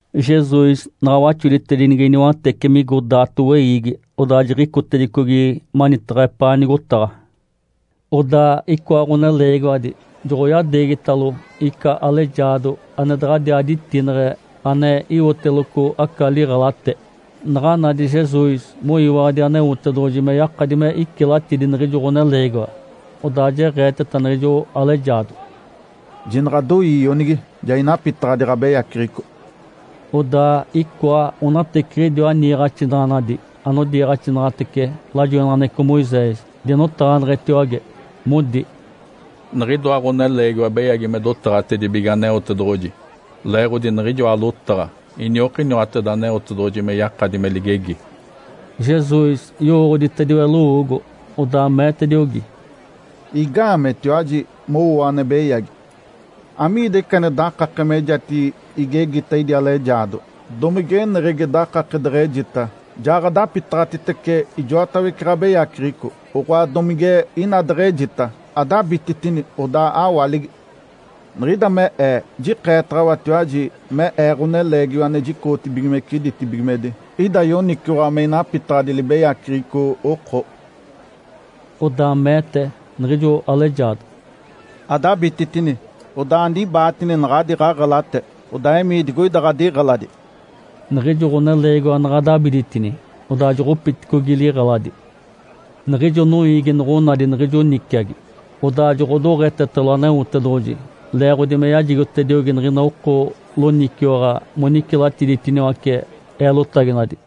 Jesus naɡ̶a waxoditedinigi niwatece migo daato weiigi, odaa jiɡ̶icotedicogi manitaɡ̶a epaa nigotaɡ̶a. Odaa icoa ɡ̶oneleegiwadi joɡ̶oyadeegitalo ica alejaado ane daɡ̶adiaa ditineɡ̶e ane iwoteloco aca liɡ̶elate. Naɡ̶a nadi Jesus moyiwaɡ̶adi Aneotedoɡ̶oji me yakadi me icilatidi niɡ̶ijo ɡ̶oneleegiwa, odaa jeɡ̶eeteta niɡ̶ijo alejaado, “Jinaɡ̶adoii, ionigi! Ja inapitaɡ̶adi ɡ̶abeyaceɡ̶eco.” Odaa icoa onateciɡ̶idiwa niiɡ̶axinaɡ̶anadi anodiiɡ̶axinaɡ̶atece lajoinaɡ̶aneɡ̶eco Moisés dinotaɡ̶aneɡ̶etiwage modi, “Niɡ̶idoa ɡ̶oneleegiwa beyagi me dotaɡ̶atedibige Aneotedoɡ̶oji leeɡ̶odi niɡ̶ijoa lotaɡ̶a iniokiniwateda Aneotedoɡ̶oji me yakadi me ligegi.” Jesus yowooɡ̶oditediwe lowoogo, odaa meetediogi, “Igaameetiwaji mowoo ane beyagi? Amiida ica ane dakake mejatigi igegita idi alejaado? Domige eneɡ̶egi dakake deɡ̶ejita, ‘Ja ɡ̶adapitaɡ̶atitece ijoatawece ɡ̶abeyaceɡ̶eco’, oɡ̶oa domige ina deɡ̶ejita, ‘Adabititini, odaa awaligi!’? Niɡ̶ida me Ee jikeetaɡ̶awatiwaji me Ee, Ǥoneleegiwa ane jicoɡ̶otibigimece ditibigimedi, ida yoniciwaɡ̶a me inapitaɡ̶adi libeyaceɡ̶eco oko.” Odaa meete niɡ̶ijo alejaado, “Adabititini, odaa anibaatine naɡ̶adi ɡ̶aɡ̶elate, odaa emii digoida ɡ̶adiɡ̶eladi!” Niɡ̶ijo ɡ̶oneleegiwa naɡ̶a dabiditini, odaa joɡ̶opiticogi liɡ̶eladi. Niɡ̶ijo noiigi noɡ̶onadi niɡ̶ijo niciagi, odaa joɡ̶odoɡ̶etetalo Aneotedoɡ̶oji, leeɡ̶odi me yajigotediogi niɡ̶ina oko loniciwaɡ̶a monicilatiditiniwace eelotaginadi.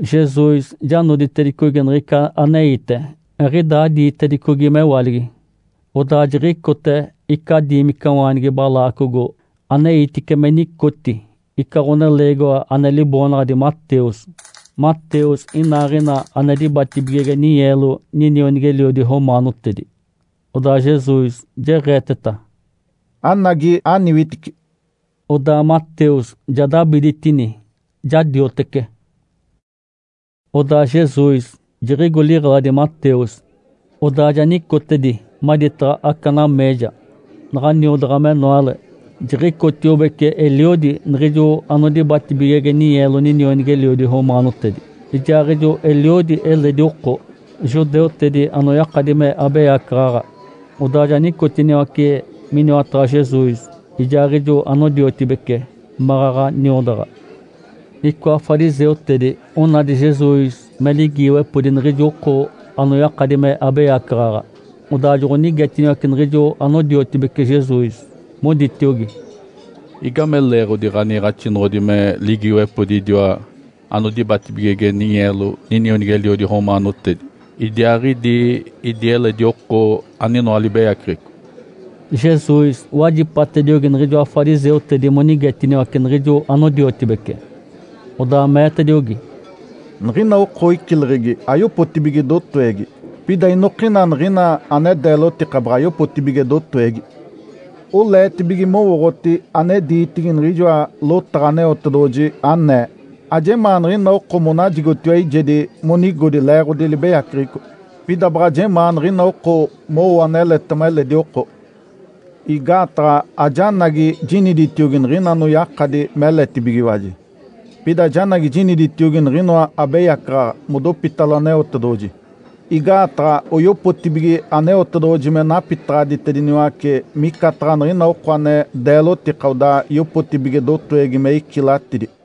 Jesus ja noditedicogi niɡ̶ica aneite, eɡ̶idaa diitedicogi mewaligi, odaa jiɡ̶icote ica diimicawaanigi balaacogo aneitice me nicoti ica ɡ̶oneleegiwa ane liboonaɡ̶adi Mateus. Mateus inaaɡ̶ina ane dibatibigege ninyeelo ninionigi-eliodi romaanotedi. Odaa Jesus jeɡ̶eeteta, “Anagi, aniwitici!” Odaa Mateus ja dabiditini, ja diotece. Odaa Jesus jiɡ̶igo liɡ̶eladi Mateus, odaa ja nicotedi maditaɡ̶a aca nameeja. Naɡ̶a niodaɡ̶a menoale, jiɡ̶icotiobece eliodi niɡ̶ijo anodibatibigege ninyeelo ninionigi-eliodi romaanotedi, ijaaɡ̶ijo eliodi eledi oko, judeutedi anoyakadi me abeyacaɡ̶aɡ̶a. Odaa ja nicotiniwace miniwataɡ̶a Jesus ijaaɡ̶ijo anodiotibece maɡ̶aɡ̶a niodaɡ̶a. Icoa fariseutedi onadi Jesus me ligiiwepodi niɡ̶idi oko anoyakadi me abeyacaɡ̶aɡ̶a, odaa joɡ̶onigetiniwace niɡ̶ijo anodiotibece Jesus, moditiogi, “Igame leeɡ̶odi ɡ̶aniiɡ̶axinoɡ̶odi me ligiiwepodi idiwa anodibatibigege ninyeelo ninionigi-eliodi romaanotedi, idiaaɡ̶idi idi eledi oko aninoa libeyaceɡ̶eco?” Jesus wajipatediogi niɡ̶ijoa fariseutedi monigetiniwace niɡ̶ijo anodiotibece, odaa meetediogi, “Niɡ̶ina oko icileɡ̶egi ayopotibige dotowegi, pida inokina niɡ̶ina ane deelotika baɡ̶a yopotibige dotowegi. Oleetibige mowooɡ̶oti ane diitigi niɡ̶ijoa lotaɡ̶a Aneotedoɡ̶oji, anee, ‘Ajemaa niɡ̶ina oko monajigotiwa eijedi monigodi leeɡ̶odi libeyaceɡ̶eco. Pida baɡ̶a jemaa niɡ̶ina oko mowo aneletema eledi oko.’ Igaataɡ̶a ajanagi jiniditiogi niɡ̶ina anoyakadi meletibigiwaji. Pida janagi jiniditiogi niɡ̶inoa abeyacaɡ̶aɡ̶a modopitalo Aneotedoɡ̶oji, igaataɡ̶a oyopotibige Aneotedoɡ̶oji me napitaɡ̶aditediniwace micataɡ̶a niɡ̶ina oko ane deelotika odaa yopotibige dotowegi me icilatidi.”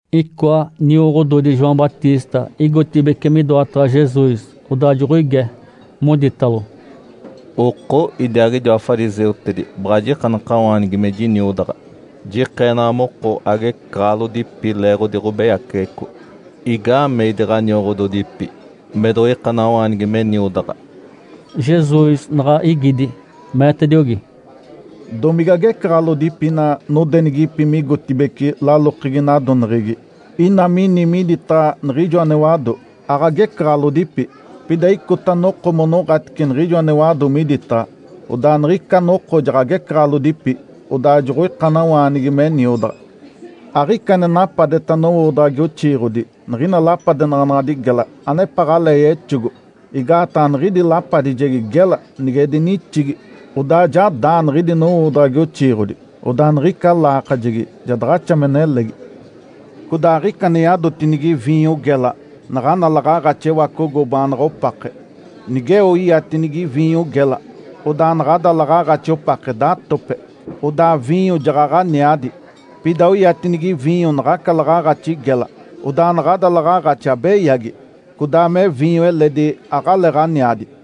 Icoa nioɡ̶ododi João Batista igotibeci midoataɡ̶a Jesus, odaa joɡ̶oige, moditalo, “Oko, idiaaɡ̶idiwa fariseutedi baɡ̶a jikanakawaanigi me jiniodaɡ̶a, jikeenaɡ̶a moko agecaɡ̶alodipi leeɡ̶odi ɡ̶obeyaceɡ̶eco. Igaamee idi ɡ̶anioɡ̶ododipi me doɡ̶oikanawaanigi me niodaɡ̶a?” Jesus naɡ̶a igidi, meetediogi, “Domige agecaɡ̶alodipi ina nodenigipi migotibeci lalokegi nadoneɡ̶egi ina mini miditaɡ̶a niɡ̶ijo ane wado? Aɡ̶agecaɡ̶alodipi! Pida icota noko monoɡ̶atice niɡ̶ijo ane wado miditaɡ̶a. Odaa niɡ̶ica noko jaɡ̶agecaɡ̶alodipi, odaa joɡ̶oikanawaanigi me niodaɡ̶a. Aɡ̶ica ane napadeta nowoodaɡ̶agi oxiiɡ̶odi niɡ̶ina lapadenaɡ̶anaɡ̶adi gela anepaɡ̶alee yexogo, igaataɡ̶a niɡ̶idi lapadijegi gela nige dinixigi, odaa ja daa niɡ̶idi nowoodaɡ̶agi oxiiɡ̶odi. Odaa niɡ̶ica laakajegi ja daɡ̶axa me nelegi. Codaa aɡ̶ica ane yadotinigi viinyo gela naɡ̶ana laɡ̶aaɡ̶axi ewacogo baanaɡ̶a opake. Nigeo iatinigi viinyo gela, odaa naɡ̶ada laɡ̶aaɡ̶axi opake datope, odaa viinyo jaɡ̶aɡ̶a aniadi. Pida oyatinigi viinyo naɡ̶aca laɡ̶aaɡ̶axi gela, odaa naɡ̶ada laɡ̶aaɡ̶axi abeyagi, codaa me viinyo eledi aɡ̶aleeɡ̶aniadi.”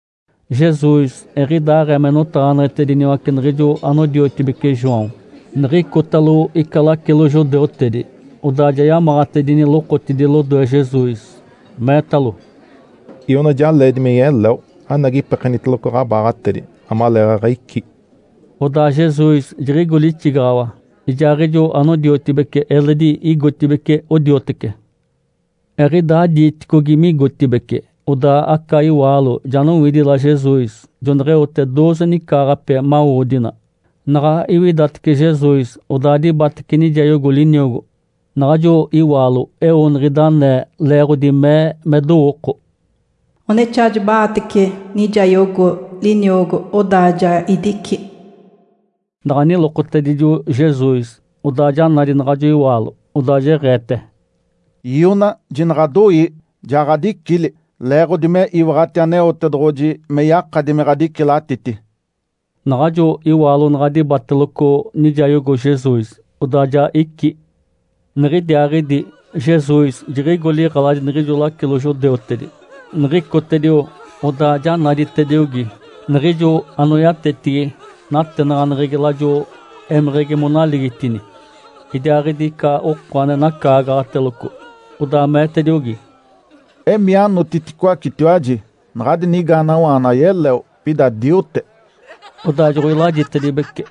Jesus eɡ̶idaaɡ̶ee me notaɡ̶aneɡ̶etediniwace niɡ̶ijo anodiotibeci João, niɡ̶icotalo ica lacilo judeutedi, odaa ja yamaɡ̶atedini lokotidi lodoe Jesus, meetalo, “Iona ja leedi me yeleo. Anagi ipekeniteloco ɡ̶abaaɡ̶atedi amaleeɡ̶aɡ̶a icí.” Odaa Jesus jiɡ̶igo lixigaɡ̶awa, ijaaɡ̶ijo anodiotibece eledi igotibeci odiotece. Eɡ̶idaa diiticogi migotibeci, odaa aca iwaalo ja nowidila Jesus. Joneɡ̶eote dooze nicaaɡ̶ape mawodina. Naɡ̶a iwidatece Jesus, odaa dibatece nijayogo liniogo. Naɡ̶ajo iwaalo eo niɡ̶ida anee, leeɡ̶odi mee me dowooko, “Onexaa jiba-aatece nijayogo liniogo, odaa ja idici.” Naɡ̶a nilokotedijo Jesus, odaa ja nadi naɡ̶ajo iwaalo. Odaa jeɡ̶eete, “Iona, jinaɡ̶adoii! Ja ɡ̶adicili, leeɡ̶odi me iwaɡ̶ati Aneotedoɡ̶oji me yakadi me ɡ̶adicilatiti.” Naɡ̶ajo iwaalo naɡ̶a dibateloco nijayogo Jesus, odaa ja icí. Niɡ̶idiaaɡ̶idi Jesus jiɡ̶igo liɡ̶eladi niɡ̶ijo lacilo judeutedi. Niɡ̶icotedio, odaa ja naditediogi niɡ̶ijo anoyatetigi natenaɡ̶aneɡ̶egi lajo émeɡ̶egi monaligitini, idiaaɡ̶idi ica oko ane nacaagaɡ̶ateloco. Odaa meetediogi, “Emii anotiticoacetiwaji! Naɡ̶adi nigaanawaana ayeleo, pida diote.” Odaa joɡ̶oilajitedibece.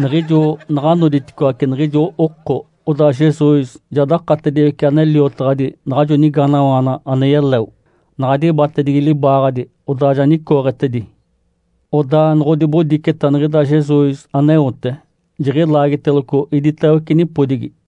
Niɡ̶ijo naɡ̶a noditicoaci niɡ̶ijo oko. Odaa Jesus ja dakatediwece ane liotaɡ̶adi naɡ̶ajo nigaanawaana ane yeleo. Naɡ̶a dibatedigi libaaɡ̶adi, odaa ja nicooɡ̶etedi. Odaa noɡ̶odibodiceta niɡ̶ida Jesus aneote jiɡ̶ilaagiteloco iditawece nipodigi.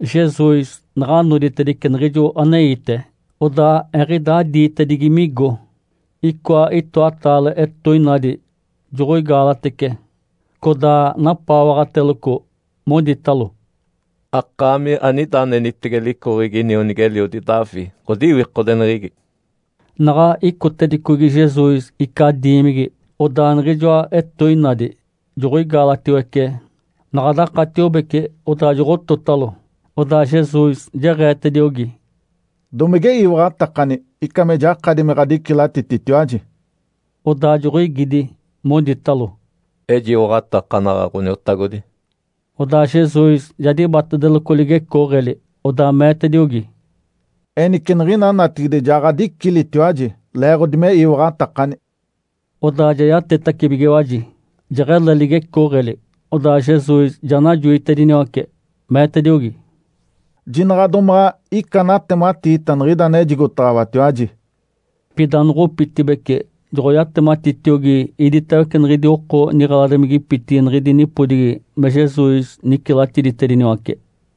Jesus naɡ̶a noditedice niɡ̶ijo aneite. Odaa eɡ̶idaa diitedigi migo, icoa itoataale etoinadi joɡ̶oigaalatece, codaa napaawaɡ̶ateloco, moditalo, “Akaami anida anenitege licoɡ̶egi inionigi-eliodi Davi, ɡ̶odiwikodeneɡ̶egi.” Naɡ̶a icotedicogi Jesus ica diimigi, odaa niɡ̶ijoa etoinadi joɡ̶oigaalatiwece. Naɡ̶a dakatiobece, odaa joɡ̶ototalo. Odaa Jesus jeɡ̶eetediogi, “Domige iwaɡ̶atakani ica me jakadi me ɡ̶adicilatititiwaji?” Odaa joɡ̶oigidi, moditalo, “Ejiwaɡ̶atakanaɡ̶a, Ǥoniotagodi.” Odaa Jesus ja dibatedeloco ligecooɡ̶eli, odaa meetediogi, “Enice niɡ̶ina natigide ja ɡ̶adicilitiwaji, leeɡ̶odi me iwaɡ̶atakani!” Odaa ja yatetibigiwaji, jeɡ̶ele ligecooɡ̶eli. Odaa Jesus ja najoitediniwace, meetediogi, “Jinaɡ̶a domaɡ̶a ica anatematiita niɡ̶ida ane ejigotaɡ̶awatiwaji!” Pida noɡ̶opitibeci, joɡ̶oyatematitiogi iditawece niɡ̶idi oko niɡ̶eladimigipitigi niɡ̶idi nipodigi me Jesus nicilatiditediniwace.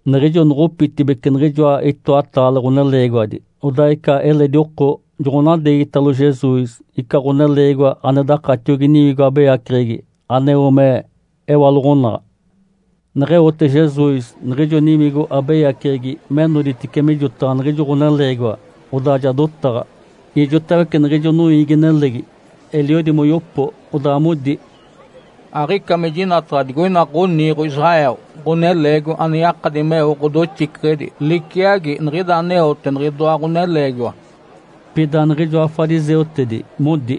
Niɡ̶ijo noɡ̶opitibeci niɡ̶ijoa itoataale ɡ̶oneleegiwadi, odaa ica eledi oko joɡ̶onadeegitalo Jesus ica ɡ̶oneleegiwa ane dakatiogi niwigo abeyaceɡ̶egi aneo me ewaloɡ̶onaɡ̶a. Neɡ̶eote Jesus niɡ̶ijo niwigo abeyaceɡ̶egi me noditice mijotaɡ̶a niɡ̶ijo ɡ̶oneleegiwa, odaa ja dotaɡ̶a. Ijotawece niɡ̶ijo noiigi-nelegi eliodi moyopo, odaa modi, “Aɡ̶ica me jinataɡ̶a digoina ɡ̶oniiɡ̶o Israel ɡ̶oneleegiwa ane yakadi meo ɡ̶odoxiceɡ̶edi liciagi niɡ̶ida aneote niɡ̶idoa ɡ̶oneleegiwa.” Pida niɡ̶ijoa fariseutedi modi,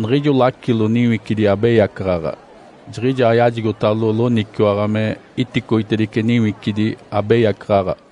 “Niɡ̶ijo lacilo niwicidi abeyacaɡ̶aɡ̶a jiɡ̶ijaa yajigotalo loniciwaɡ̶a me iticoitedice niwicidi abeyacaɡ̶aɡ̶a.”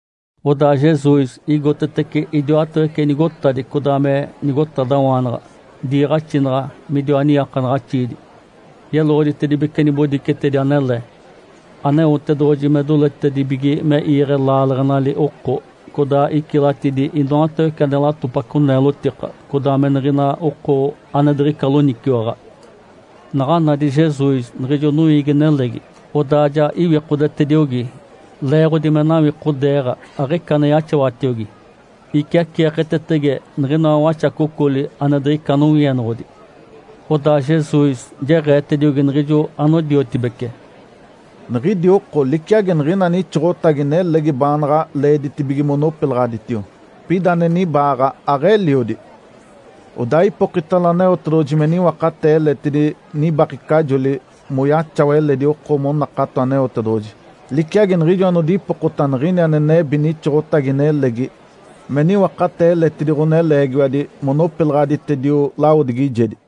Odaa Jesus igotetece idiwatawece nigotadi codaa me nigotadawaanaɡ̶a, diiɡ̶axinaɡ̶a midiwa niiakanaɡ̶axiidi, yeloɡ̶oditedibece nibodicetedi anele, Aneotedoɡ̶oji me doletedibige me iiɡ̶e laaleɡ̶enali oko, codaa icilatidi inoatawece ane latopaco neelotika, codaa me niɡ̶ina oko ane diɡ̶ica loniciwaɡ̶a. Naɡ̶a nadi Jesus niɡ̶ijo noiigi-nelegi, odaa ja iwikodetediogi, leeɡ̶odi me nawikodeeɡ̶a, aɡ̶ica ane yaxawatiogi, iciaceeketetege niɡ̶inoa waxacocoli ane diɡ̶ica nowienoɡ̶odi. Odaa Jesus jeɡ̶eetediogi niɡ̶ijo anodiotibece, “Niɡ̶idi oko liciagi niɡ̶ina nixoɡ̶otagi nelegi baanaɡ̶a leeditibige monopilaɡ̶aditio. Pida ane nibaaɡ̶a aɡ̶eliodi. Odaa ipokitalo Aneotedoɡ̶oji me niwakatee eletidi nibakecajoli moyaxawa eledi oko monakato Aneotedoɡ̶oji, liciagi niɡ̶ijo anodipokota niɡ̶ini ane nebi nixoɡ̶otagi nelegi me niwakatee eletidi ɡ̶oneleegiwadi monopilaɡ̶aditedio lawodigijedi.”